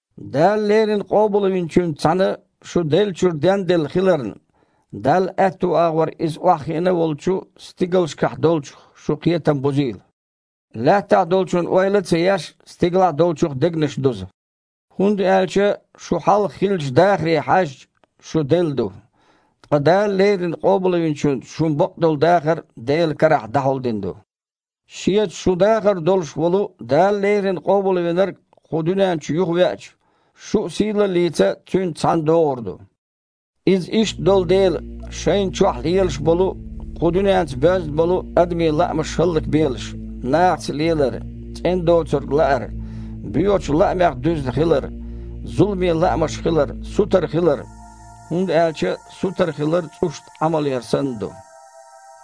Дала леррина Къобалвинчуьнца цхьаьна шу деллачуьра денделла хиларна, Далла аьтту агІор Иза охьахиина волчу стигалшкахь долчух шун кхетам бузийла. Лаьттахь долчун ойла а ца еш, стигалахь долчух дегнаш дуза. ХІунда аьлча шун хьалха хиллачу дахаре хьаьжча, шу делла ду, ткъа Дала леррина Къобалвинчуьнца шун бакъдолу дахар Делан карахь дІахьулдина ду. Шеца шун дахар долуш волу Дала леррина Къобалвинарг кху дуьнен чу юхавеача, шу а сийлаллица Цуьнца цхьаьна догІур ду. Иза иштта долу дела, шайна чохь лелаш болу а, кху дуьненца боьзна болу а адамийн лаамаш хІаллакбелаш: нахаца лелар, цІена доцург лаар, боьхачу лаамех дуьзна хилар, зуламе лаамаш хилар, сутара хилар (хІунда аьлча сутара хилар цІушна Іамал яр санна ду).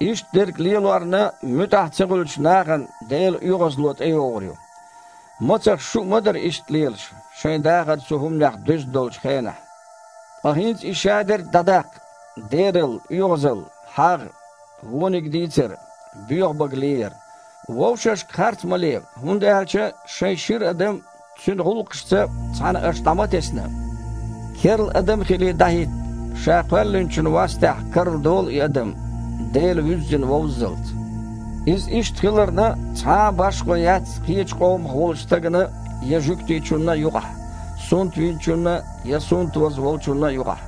Иштта дерг лелорна муьтІахь ца хуьлучу нахана Делан оьгІазло тІейогІур ю. Мацах шу а ма дара иштта лелаш, шайн дахар цу хІуманех дуьзна долчу хенахь. Ткъа хІинца и шадерг дІадаккха: дералла, оьгІазалла, хьагІ, вониг дийцар, боьха бага леяр. Вовшашка харц ма ле, хІунда аьлча шайн шира адам цуьнан гІуллакхашца цхьаьна аша дІа ма тесна. Керла адам а хилий, дІахІитта. Ша Кхоьллинчун вастехь карладолу и адам, Дела вуьззина вовззалц. Иза иштта хиларна, цхьа а башхо яц кхечу къомах волчу стагана я жуьгтичунна юкъахь, сунтвинчунна я сунтваза волчунна юкъахь,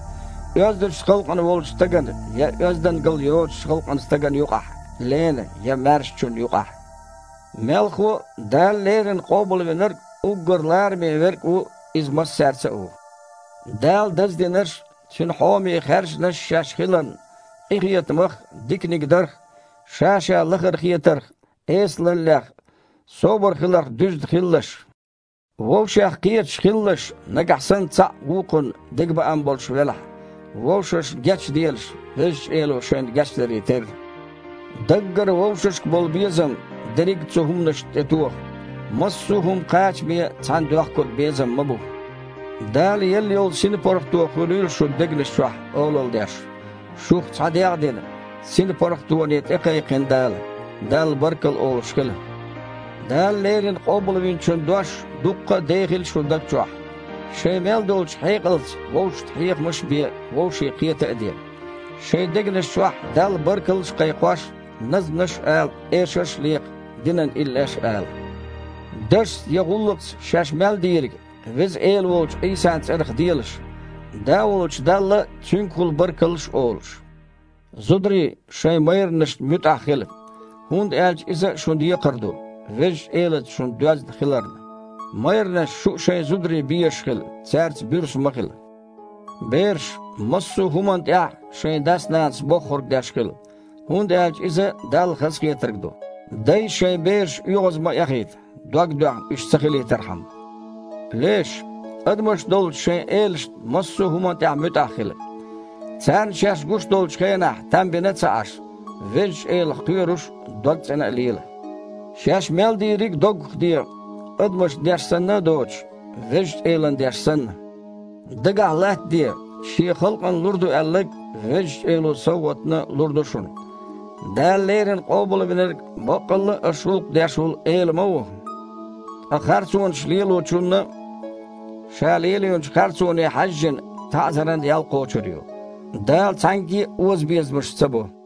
оьздачу халкъан волчу стагана я оьздалла йоцучу халкъан стагана юкъахь, лена я маьршачунна юкъахь. Мелхо а, Дала леррина Къобалвинарг уггар лараме Верг а ву, Иза массаьрца а ву. Дала даздинарш а, Цуьнан хьоме хаьржинарш а шаьш хиларна, къинхетамах, диканиг дарх, ша-ша лахара хетарх, эсалаллех, собар хиларх дуьзна хилалаш. Вовшех кхеташ хилалаш, нагахь санна цхьаъ вукхунна дегабаам болуш велахь, вовшашна гечделаш, Везачу Эло шайна гечдаре терра. Даггара вовшашка болу безам дерриг а цу хІуманашна тІетоха. Массо а хІума кхачаме цхьаьна доьхкург безам ма бу. Дала елла йолу синпаргІато хуьлийла шун дегнаш чохь олалла деш. Шух цхьа дегІ а дина, синпаргІатоне тІекхайкхина Дала. Далла баркалла олуш хила. Дала леррина Къобалвинчун дош дуккха а дехийла шун даг чохь. Шайн мел долчу хьекъалца вовшашна хьехамаш а бе, вовшийн кхета а де. Шайн дегнаш чохь Далла баркаллаш а кхайкхош, назманаш а ала, эшарш а лекха, динан иллеш а ала. Дашца я гІуллакхца шаьш мел дийриг Веза Эла волчу Іийсан цІарах делаш, Да волчу Далла Цуьнгахула баркаллаш а олуш. Зударий, шайн майранашна муьтІахь хила, хІунда аьлча иза шун декхар ду, Везачу Элаца шу доьзна хиларна. Майранаш, шу а шайн зударий безаш хила, цаьрца буьрса ма хила. Бераш, массо а хІуманна тІехь шайн дас-нанас боххург деш хила, хІунда аьлча иза Далла хазахетарг ду. Дай, шайн бераш оьгІаз ма эхийта, дог доьхна уьш ца хилийтархьама. Леш, адамаш долчу шайн элашна массо а хІуманна тІехь муьтІахь хила. Царна шаьш гуш долчу хенахь там бина а ца Іаш, Везачу Элах кхоьруш а, догцІена а лела. Шаьш мел дийриг а доггах де, адамашна деш санна а доцуш, Везачу Элана деш санна. Дагахь латтаде, Шен халкъана лур ду аьлларг Везачу Эло совгІатна лур ду шуна. Дала леррина Къобалвинарг баккъалла а аша гІуллакх деш волу Эла ма ву. Ткъа харцонаш лелочунна, ша лелийначу харцоне хьаьжжина, таІзаран ял кхочур ю. Дала цхьаьнгге а озабезамаш ца бо.